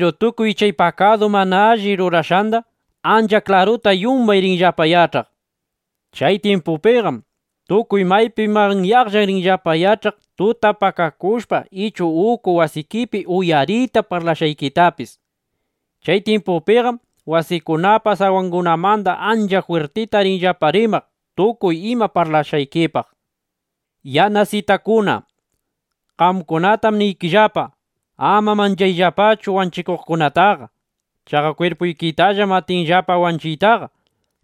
Piru tukuy chay pakadu mana allita rurashqanda ancha klaruta yumbay rinllapa yach'aq. Chay tyimpupiqam tukuy maypi manyaqlla rinllapa yach'aq tutap pakakushpa ichu uku wasikipi uyaritap (uyarita) parlashqaykitapis. Chay tyimpupiqam wasikunapa sawangunamanda ancha jwirtita rinllapa rimaq tukuy ima parlashqaykipaq, nishpa. ’Yanasitakuna (Yanasitukuna), qamkunatam niykillapa, ama manchayllapachu wanchikuqkunataqa. Chaqa kwirpuykitallam atinllapa wanchiytaqa.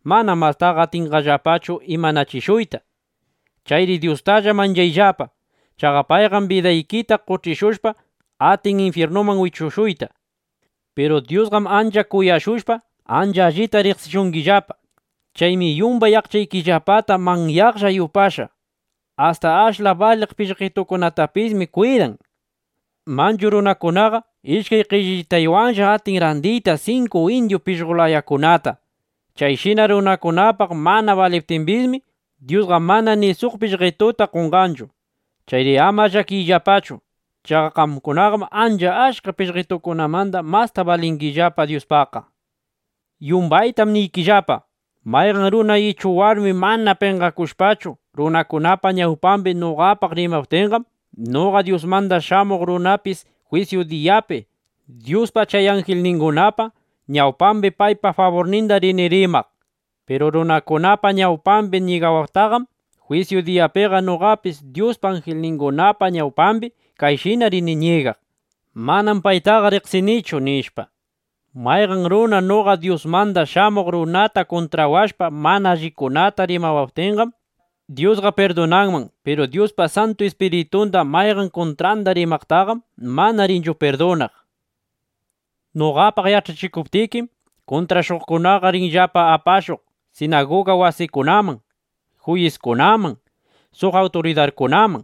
Manam mastaqa atinllapachu imanachishuyta. Chayri Dyustalla manchayllapa. Chaqa payqam bidaykita qoch'ishushpa, atin infyirnuman wichushuyta. ’Piru Dyusqam ancha kuyashushpa, ancha allita riqsishungillapa. Chaymi yumbay aqchaykillapata manyaqlla yupashqa. Asta ashla baliq pishqetukunatapismi kwidan. Manchu runakunaqa ishkay qellitaywanlla atin randiyta sinku indyu pishqo layakunata. Chayshina runakunapaq mana baliptimbismi, Dyusqa mana ni suq pishqetuta qonqanchu. Chayri ama llakiyllapachu. Chaqa qamkunaqam ancha achka pishqetukunamanda masta balingillapa Dyuspaqqa. ’Yumbaytam niykillapa, mayqan runa ichu warmi mana penqakushpachu, runakunapa ñawpambi noqapaq rimaptinqam, noqa Dyusmanda Shamuq Runapis jwisyu diyapi Dyuspa chay anjilningunapa ñawpambi paypa faburninda rini rimaq. Piru runakunapa ñawpambi ñigawaqtaqam, jwisyu diyapiqa noqapis Dyuspa anjilningunapa ñawpambi kayshina rini ñigaq: “Manam paytaqa riqsinichu”, nishpa. ’Mayqan runa noqa Dyusmanda Shamuq Runata kuntrawashpa mana allikunata rimawaptinqam, Dyusqa pirdunanman. Piru Dyuspa Santu Ispiritunda mayqan kuntranda rimaqtaqam mana rinchu pirdunaq. ’Noqapaq yach'achikuptikim, kuntrashuqkunaqa rinllapa apashuq sinaguga wasikunaman, juyiskunaman, suq awturidarkunaman.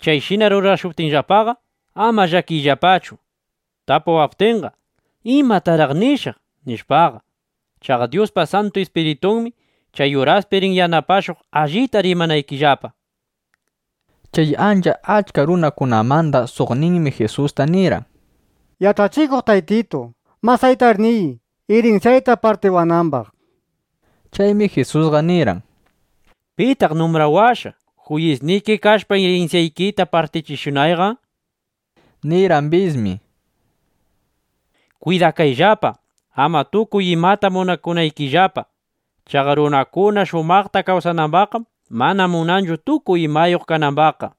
Chayshina rurashuptinllapaqa, ama llakiyllapachu: Tapuwaptinqa, ¿imataraq nishaq? nishpaqa. Chaqa Dyuspa Santu Ispiritunmi chay uraspi rin yanapashuq, allita rimanaykillapa. Chay ancha achka runakunamanda suqninmi Jisusta nirqan: —Yach'achikuq Taytitu, masaytar niy, irinsyayta partiwanambaq, nishpa. Chaymi Jisusqa nirqan: —¿Pitaq numbrawashqa, juyisniki kashpa, irinsyaykita partichishunayqa? nishpa. Nirqambismi: —Kwidakayllapa, ama tukuy imata munakunaykillapa. Chaqa runakuna shumaqta kawsanambaqqam mana munanchu tukuy imayuq kanambaqqa.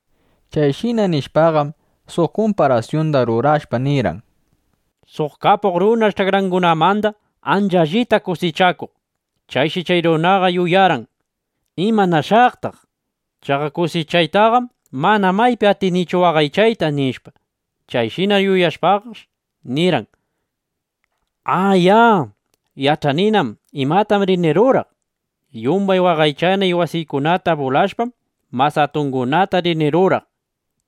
Chayshina nishpaqam, suq kumparasyunda rurashpa nirqan: —Suq kapuq runash ch'akrangunamanda ancha allita kusichakuq. Chayshi chay runaqa yuyarqan: “¿Imanashaqtaq? Chaqa kusichaytaqam mana maypi atinichu waqaychayta”, nishpa. Chayshina yuyashpaqash nirqan: “¡A, ya! Yach'aninam imatam rini ruraq. Yumbay waqaychana wasiykunata bulashpam, mas atungunata rini ruraq,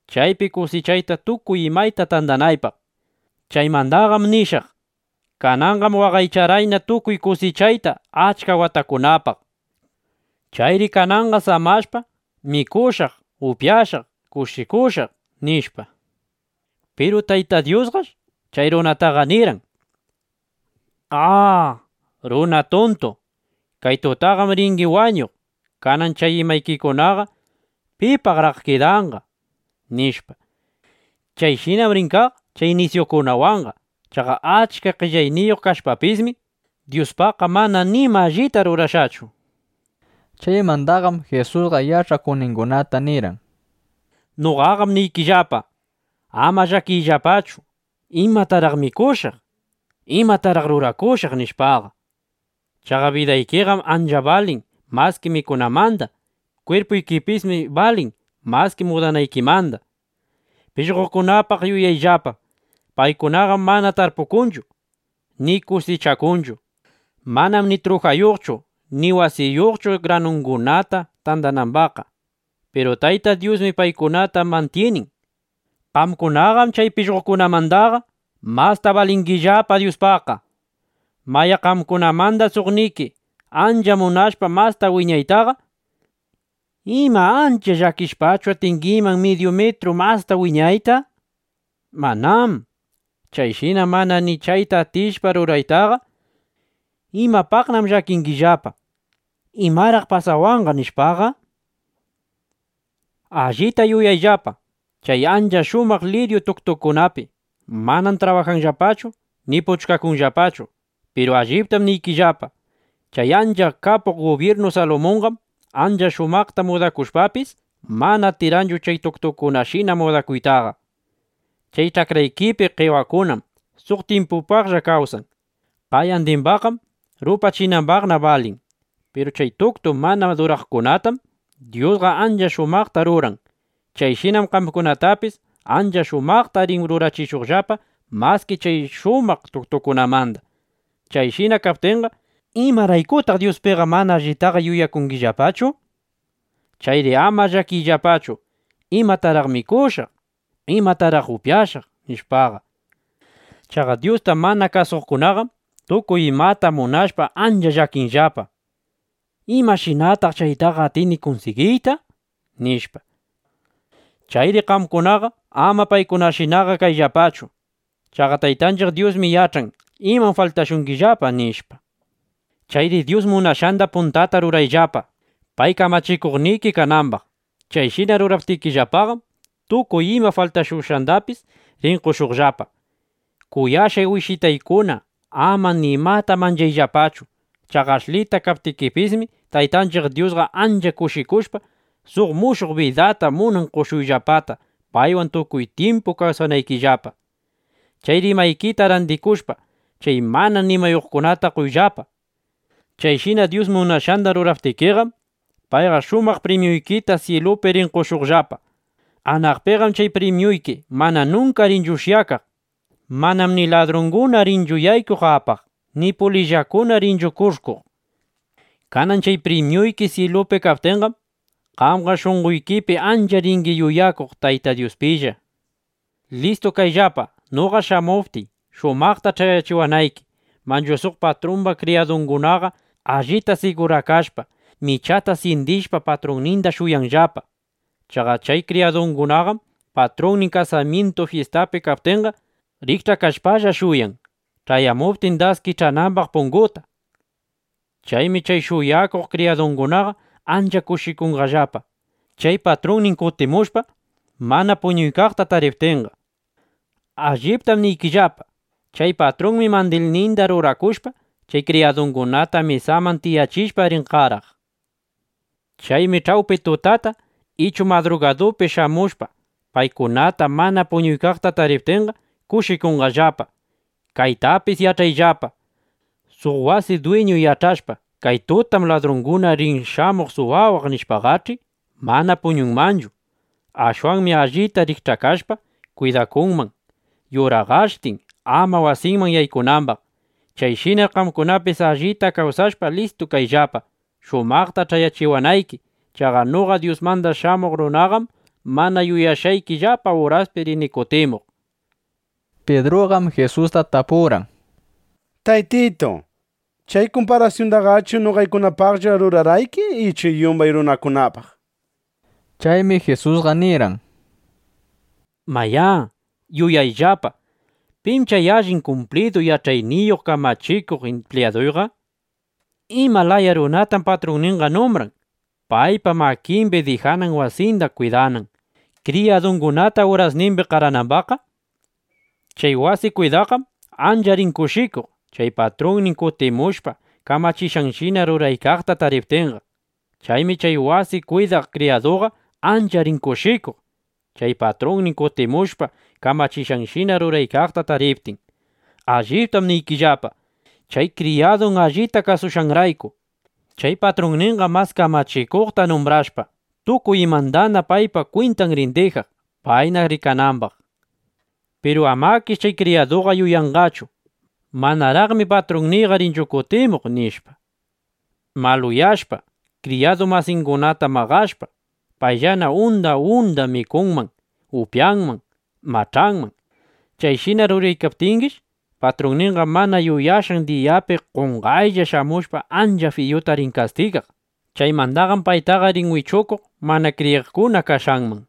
chaypi kusichayta tukuy imayta tandanaypaq. Chaymandaqam nishaq: Kananqam waqaycharqayna tukuy kusichayta achka watakunapaq. Chayri kananqa samashpa, mikushaq, upyashaq, kushikushaq”, nishpa. Piru Tayta Dyusqash chay runataqa nirqan: “A, runa tuntu, kay tutatam ringi wañuq. Kanan chay imaykikunaqa, ¿pipaqraq kidanqa?” nishpa. Chayshinam rin kaq chay nisyukunawanqa. Chaqa achka qellayniyuq kashpapismi, Dyuspaqqa mana nima allita rurashqachu. Chaymandaqam Jisusqa yach'akuqningunata nirqan: —Noqaqam niykillapa, ama llakiyllapachu, ¿imataraq mikushaq? ¿Imataraq rurakushaq? nishpaqa. Chaqa bidaykiqam ancha balin maski mikunamanda. Kwirpuykipismi balin maski mudanaykimanda. Pishqokunapaq yuyayllapa: Paykunaqam mana tarpukunchu, ni kusichakunchu. Manam ni trujayuqchu ni wasiyuqchu, granukunata tandanambaqqa. Piru Tayta Dyusmi paykunata mantyinin. Qamkunaqam chay pishqokunamandaqa masta balingillapa Dyuspaqqa. Mayá, qamkunamanda suqniki ancha munashpa masta wiñaytaqa, ¿ima ancha llakishpachu atingiman midyu mitru masta wiñayta? ¡Manám! Chayshina mana ni chayta atishpa ruraytaqa, ¿imapaqnam llakingillapa, imaraq pasawanqa, nishpaqa? ’Allita yuyayllapa chay ancha shumaq liryu tuktukunapi. Manam trabajanllapachu ni puchkakunllapachu. Piru alliptam niykillapa, chay ancha kapuq gubyirnu Salumunqam ancha shumaqta mudakushpapis, mana atirqanchu chay tuktukunashina mudakuytaqa. Chay ch'akraykipi qewakunam suq tyimpitulla kawsan. Qayandimbaqqam rupachinapaqna balin. Piru chay tuktu mana duraqkunatam Dyusqa ancha shumaqta ruran. Chayshinam qamkunatapis ancha shumaqta rin rurachishuqllapa maski chay shumaq tuktukunamanda. Chayshina kaptinqa, ¿imaraykutaq Dyuspiqa mana allitaqa yuyakungillapachu? Chayri ama llakiyllapachu, ¿imataraq mikushaq? ¿Imataraq upyashaq? nishpaqa. Chaqa Dyusta mana kasuqkunaqam tukuy imata munashpa, ancha llakinllapa: ¿Imashinataq chaytaqa atini kunsigiyta? nishpa. Chayri qamkunaqa ama paykunashinaqa kayllapachu. Chaqa Taytanchiq Dyusmi yach'an imam faltashungillapa, nishpa. Chayri Dyus munashqanda puntata rurayllapa, pay kamachikuqniki kanambaq. Chayshina ruraptikillapaqam, tukuy ima faltashushqandapis rin qoshuqllapa. ’Kuyashqay wishitaykuna, ama nimata manchayllapachu. Chaqa ashlita kaptikipismi, Taytanchiq Dyusqa ancha kushikushpa, suq mushuq bidata munan qoshuyllapata, paywan tukuy tyimpu kawsanaykillapa. Chayri imaykita randikushpa, chay mana nimayuqkunata qoyllapa. Chayshina Dyus munashqanda ruraptikiqam, payqa shumaq primyuykita syilupi rin qoshuqllapa. Anaqpiqam chay primyuyki mana nunka rinchu ushyakaq. Manam ni ladrunguna rinchu yaykuq apaqqa, ni pulillakuna rinchu kush'kuq. Kanan chay primyuyki syilupi kaptinqam, qamqa shunqoykipi ancha ringi yuyakuq Tayta Dyuspilla. ’Listu kayllapa, noqa shamuptiy, shumaqta ch'ayachiwanayki. Manchu suq patrumba kriyadungunaqa, allita sigurakashpa, michata syindishpa, patrunninda shuyanllapa. Chaqa chay kriyadukunaqam patrunnin kasamyintu fyistapi kaptinqa, rikch'aykashpalla shuyan, ch'ayamuptin, das kich'anambaq punguta. Chaymi chay shuyakuq kriyadukunaqa ancha kushikunqallapa, chay patrunnin kutimushpa, mana puñuykaqta tariptinqa. Alliptam niykillapa, chay patrunmi, mandilninda rurakushpa, chay kriyadungunata mesaman tiyachishpa, rin qaraq. Chaymi ch'awpi tutata ichu madrugadupi shamushpa, paykunata mana puñuykaqta tariptinqa, kushikunqallapa. Kaytapis yach'ayllapa, suq wasi dwiñu yach'ashpa: Kay tutam ladrunqa rin shamuq suwawaq, nishpaqach'i, mana puñunmanchu. Ashwanmi allita rikch'ashpa, kwidakunman yuraqashtin, ama wasinman yaykunambaq. Chayshinar qamkunapis allita kawsashpa, listu kayllapa, shumaqta ch'ayachiwanayki. Chaqa noqa Dyusmanda Shamuq Runaqam mana yuyashqaykillapa uraspi rini kutimuq, nishpa. Pidruqam Jisusta tapurqan: —Taytitu, ¿chay kumparasyundaqachu noqaykunapaqlla rurarqayki ichu yumbay runakunapaq? nishpa. Chaymi Jisusqa nirqan: —Mayá, yuyayllapa, ¿pim chay allin kumplidu yach'ayniyuq kamachikuq impliyaduqa? ¿Ima laya runatam patrunninqa numbran, paypa makimbi dijanan wasinda kwidanan, kriyadungunata urasnimbi qaranambaqqa? Chay wasi kwidaqqam ancha rin kushikuq, chay patrunnin kutimushpa, kamachishqanshina ruraykaqta tariptinqa. Chaymi chay wasi kwidaq kriyaduqa ancha rin kushikuq, chay patrunnin kutimushpa, kamachishqanshina ruraykaqta tariptin. Alliptam niykillapa, chay kriyadun allita kasushqanrayku, chay patrunninqa mas kamachikuqta numbrashpa, tukuy imandana paypa kwintan rin dijaq, payna rikanambaq. Piru amakish chay kriyaduqa yuyanqachu: Manaraqmi patrunniyqa rinchu kutimuq, nishpa, maluyashpa, kriyadu masingunata maqashpa, payllana unda unda mikunman, upyanman, mach'anman. Chayshina ruraykaptingish, patrunninqa mana yuyashqan diyapi, qonqaylla shamushpa, ancha fiyuta rin kastigaq. Chaymandaqam paytaqa rin wichukuq mana kriyiqkuna kashqanman.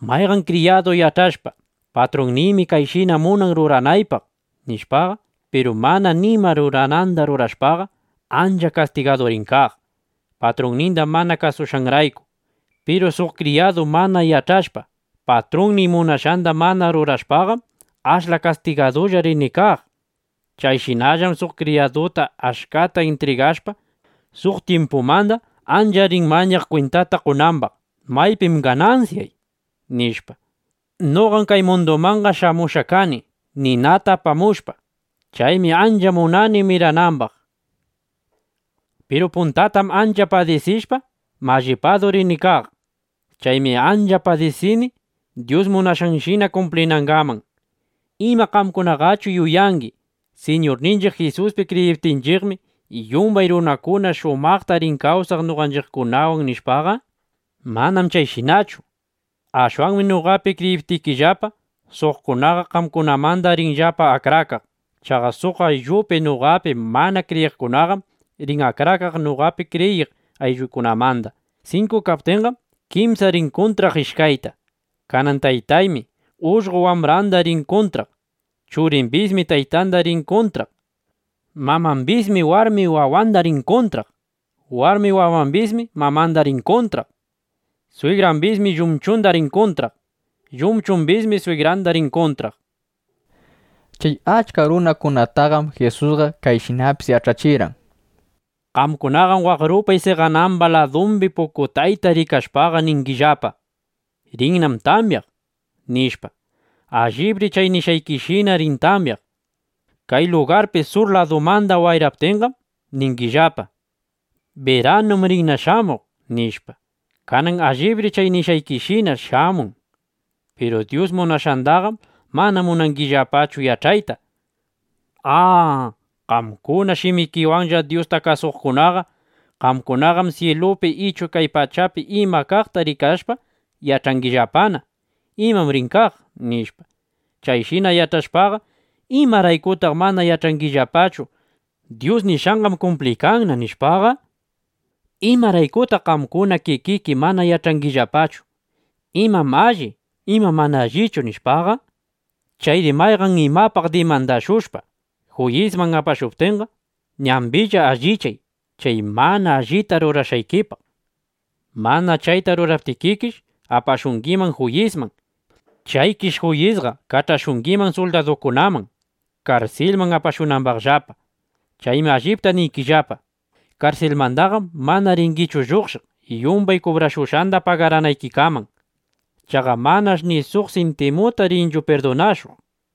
’Mayqan kriyadu yach'ashpa: Patrunniymi kayshina munan ruranaypaq, nishpaqa, piru mana nima rurananda rurashpaqa, ancha kastigadu rin kaq, patrunninda mana kasushqanrayku. Piru suq kriyadu mana yach'ashpa, patrunnin munashqanda mana rurashpaqam, ashla kastigadulla rin kaq. Chayshinallam suq kriyaduta achkata intrigashpa, suq tyimpumanda ancha rin mañaq kwintata qonambaq: ¿Maypim ganansyay? nishpa. ’Noqam kay mundumanqa shamushqa kani, ninata apamushpa. ¡Chaymi ancha munani miranambaq! Piru puntatam ancha padisishpa, mallipadu rini kaq. Chaymi ancha padisini Dyus munashqanshina kumplinangaman. ¿Ima qamkunaqachu yuyangi: Siñurninchiq Jisuspi kriyiptinchiqmi, yumbay runakuna shumaqta rin kawsaq noqanchiqkunawan, nishpa? Manam chayshinachu. Ashwanmi noqapi kriyiptikillapa, suqkunaqa qamkunamanda rinllapa akrakaq. Chaqa suq ayllupi noqapi mana kriyiqkunaqam rin akrakaq noqapi kriyiq ayllungunamanda. Sinku kaptinqam, kimsa rin kuntraq ishkayta. Kanan taytanmi ullqo wambranda rin kuntraq. Churimbismi taytanda rin kuntraq. Mamambismi warmi wawanda rin kuntraq. Warmi wawambismi mamanda rin kuntraq. Swigrambismi llumchunda rin kuntraq. Llumchumbismi swigranda rin kuntraq, nishpa. Chay achka runakunataqam Jisusqa kayshinapis yach'achirqan: —Qamkunaqam waq rupay seqanamba ladumbi pukutayta rikashpaqa ningillapa: “Rinnam tamyaq”, nishpa. Allibri chay nishqaykishina rin tamyaq. Kay lugarpi sur ladumanda wayraptinqam, ningillapa: “Biranum rinna shamuq”, nishpa. Kanan allibri chay nishqaykishina shamun. Piru Dyus munashqandaqam mana munangillapachu yach'ayta. ¡A, qamkuna shimikiwanlla Dyusta kasuqkunaqa! Qamkunaqam syilupi ichu kay pachapi ima kaqta rikashpa yach'angillapana: Imam rin kaq, nishpa. Chayshina yach'ashpaqa, ¿imaraykutaq mana yach'angillapachu: Dyus nishqanqam kumpliykanna, nishpaqa? ’¿Imaraykutaq qamkuna kikiki mana yach'angillapachu: Imam alli, imam mana allichu, nishpaqa? Chayri mayqan imapaq dimandashushpa, juyisman apashuykaptinqa, ñambilla alliyay chay mana allita rurashqaykipaq. Mana chayta ruraptikikish, apashungiman juyisman. Chaykish juyisqa kach'ashungiman suldadukunaman, karsilman apashunambaqllapa. Chaymi allipta niykillapa, karsilmandaqam mana ringichu lluqshiq yumbay kubrashushqanda pagaranaykikaman. Chaqa manash' ni suq sintimuta rinchu pirdunashuq.